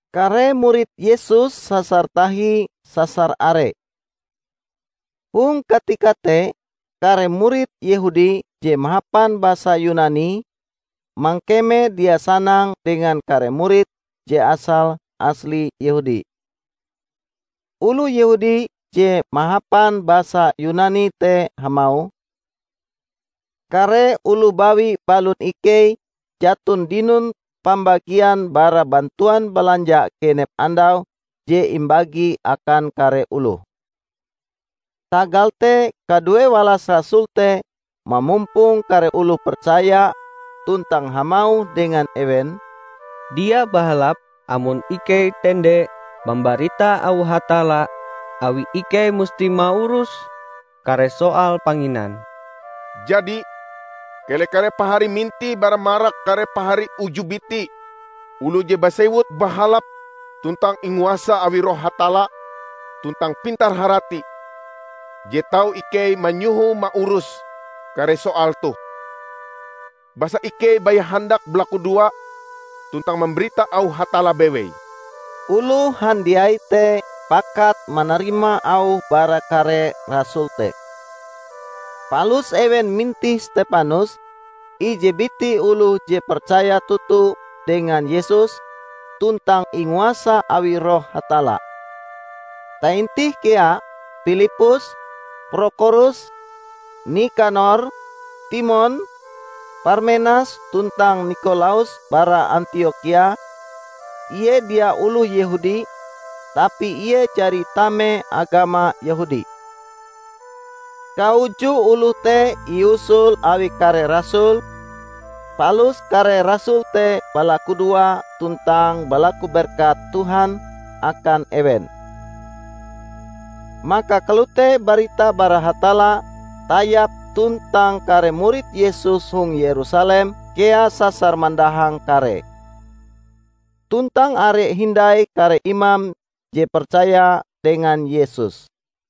Kare murid Yesus sasar tahi sasar are. Hong katika te kare murid Yehudi je mahapan basa Yunani, mangkeme dia sanang dengan kare murid je asale asli Yehudi. Oloh Yehudi je mahapan basa Yunani te hamauh, "Kare oloh bawi balon ikei jaton dinon pambagian bara bantuan balanja genep andau je imbagi akan kare oloh." Tagal te kaduewalas rasul te mamumpong kare oloh percaya tuntang hamauh dengan ewen, "Dia bahalap amon ikei tende mambarita auh Hatalla, awi ikei musti maurus kare soal panginan. Jadi, keleh kare pahari mintih bara marak kare pahari uju biti oloh je basewut bahalap tuntang inguasa awi Roh Hatalla tuntang pintar-harati, je tau ikei manyohoe maurus kare soal toh; basa ikei baya handak balakudoa tuntang mambarita auh Hatalla bewei." Oloh handiai te pakat manarima auh bara kare rasul te. Palus ewen mintih Stepanus, ije biti oloh je percaya toto dengan Yesus tuntang inguasa awi Roh Hatalla. Taintih kea: Pilippus, Prokhorus, Nikanor, Timon, Parmenas tuntang Nikolaus bara Antiokhia; ie dia oloh Yehudi, tapi ie jari tame agama Yehudi. Kauju oloh te iusul awi kare rasul, palus kare rasul te balakudoa tuntang balaku berkat Tuhan akan ewen. Maka kalote barita bara Hatalla tayap tuntang kare murid Yesus hong Yerusalem kea sasar mandahang karee. Tuntang are hindai kare imam je percaya dengan Yesus.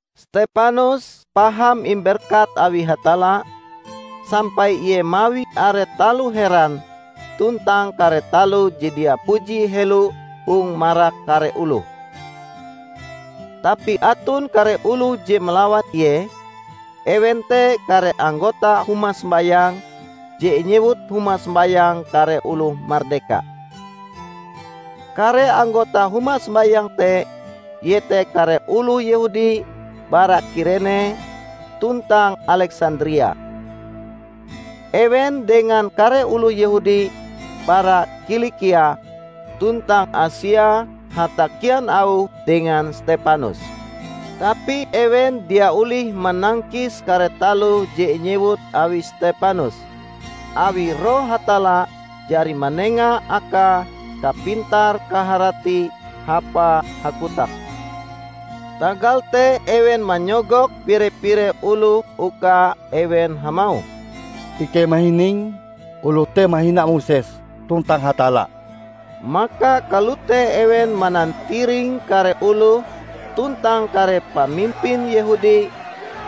Stepanus paham imberkat awi Hatalla, sampai ie mawi are taloh heran tuntang kare taloh je dia puji helo hong marak kare oloh. Tapi aton kare oloh je malawan ie; ewen te kare anggota huma sombayang je inyewut Huma Sombayang Kare Oloh Mardeka. Kare anggota huma sombayang te iete kare oloh Yehudi bara Kirene tuntang Aleksandria. Ewen dengan kare oloh Yehudi bara Kilikia tuntang Asia hatakian auh dengan Stepanus. Tapi ewen dia olih manangkis kare taloh je inyewut awi Stepanus, awi Roh Hatalla jari manenga akae kapintar-kaharati hapae hakotak. Tagal te ewen manyogok pire-pire oloh uka ewen hamauh, "Ikei mahining oloh te mahina Moses tuntang Hatalla!" Maka kalote ewen manantiring kare oloh tuntang kare pamimpin Yehudi,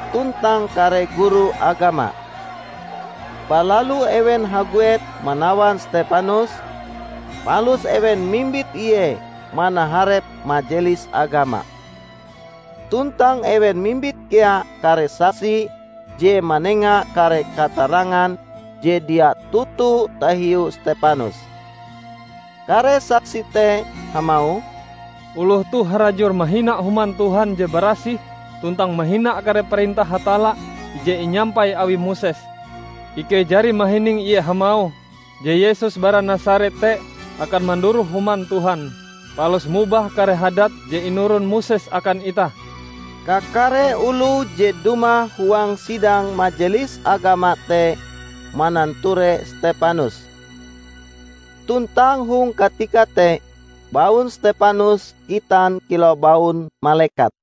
tuntang kare guru agama. Balalu ewen haguet manawan Stepanus, palus ewen mimbit ie manaharep Majelis Agama. Tuntang ewen mimbit kea kare saksi je manenga kare katarangan je dia toto tahiu Stepanus. Kare saksi te hamauh, "Oloh toh harajur mahina Human Tuhan je barasih tuntang mahina kare parentah Hatalla je inyampai awi Moses. Ikei jari mahining Ie hamauh, je Yesus bara Nasaret te akan manduroh Human Tuhan, palus mobah kare hadat je inuron Moses akan itah!" Kakare oloh je dumah huang sidang majelis agama te mananture Stepanus. Tuntang hong katika te baun Stepanus gitan kilau baun malekat.